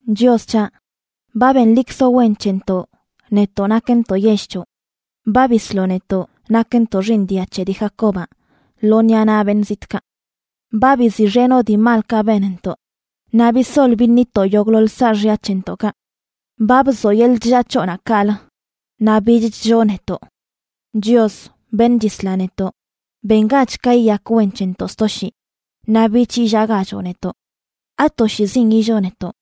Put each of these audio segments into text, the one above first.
Chios c̱haꞌ, ba benlikzoꞌ wen c̱hentoꞌ, netoꞌ nakntoꞌ yell c̱hoꞌ; ba bisloꞌ netoꞌ nakntoꞌ xiiṉ dia c̱he dii Jacobaꞌ lo ṉiꞌa naꞌ beṉꞌ zitꞌkaꞌ. Ba biziꞌxenoꞌ dii malkaꞌ benntoꞌ naꞌ bisol biṉitoꞌ yogꞌḻoḻ saaxya c̱hentoꞌkaꞌ. Ba bzoꞌ yeḻꞌ chllaa c̱hoꞌnaꞌ kaꞌlə, naꞌ bich chlloo netoꞌ. Chios, beṉꞌ chisla netoꞌ, ¡bengach ka yiyak wen c̱hentoꞌ sto shii, naꞌ bich illaagachoꞌ netoꞌ! ¿Atoshiizin illoo netoꞌ?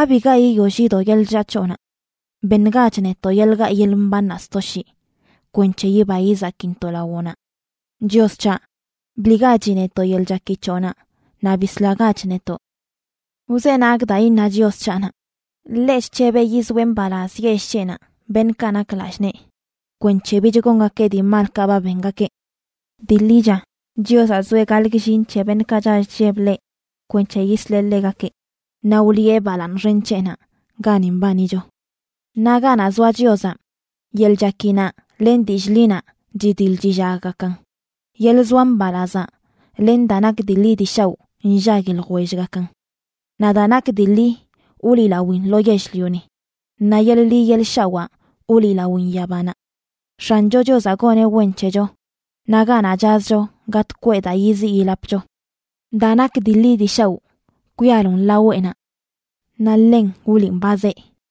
¿Abiga yiyoll yido yeḻꞌ chllaa c̱hoꞌnaꞌ? Beṉgach netoꞌ yeḻꞌ gaꞌ yeḻꞌ mbannaꞌ sto shii, kwenc̱he yiba yizakintoꞌ lawoꞌnaꞌ. Chios c̱haꞌ, ¡bliꞌgachi netoꞌ yeḻꞌ chaki c̱hoꞌnaꞌ, naꞌ bislagach netoꞌ! Wzenagꞌ daa iṉa Chios c̱haꞌnaꞌ; ḻeꞌ chc̱hebeꞌ yizoeꞌ mbalaz yell c̱heꞌnaꞌ, beṉꞌkaꞌ nak lallꞌ nee, kwenc̱he bich gongakeꞌ dii malkaꞌ ba bengakeꞌ. Dii ḻicha, Chiozaꞌ zoeꞌ gaḻꞌ gllin c̱he beṉꞌkaꞌ chall chlleb ḻeꞌ, kwenc̱he yisleꞌ ḻegakeꞌ naꞌ wliꞌe balaaṉ xen c̱heꞌnaꞌ gani mbanicho. Naꞌ ganaꞌ zoa Chiozaꞌ, yeḻꞌ chakinaꞌ len dillꞌ ḻinaꞌ chidiḻ chillaggakan; yeḻꞌ zoa mbalazaꞌ len daa nak dii ḻi dii shaoꞌ nllagui ljwellgakan. Naꞌ daa nak dii ḻi wliꞌlawin lo yell-lioni, naꞌ yeḻꞌ ḻi yeḻꞌ shawaa wliꞌlawin yabanaꞌ. X̱ancho Chiozaꞌ goneꞌ wen c̱hecho, naꞌ ganaꞌ chazcho gatꞌ kweꞌ daa yiziꞌ yilapcho. Daa nak dii ḻi dii shaoꞌ kwialon laweꞌnaꞌ naꞌ ḻen wliꞌn ba zee.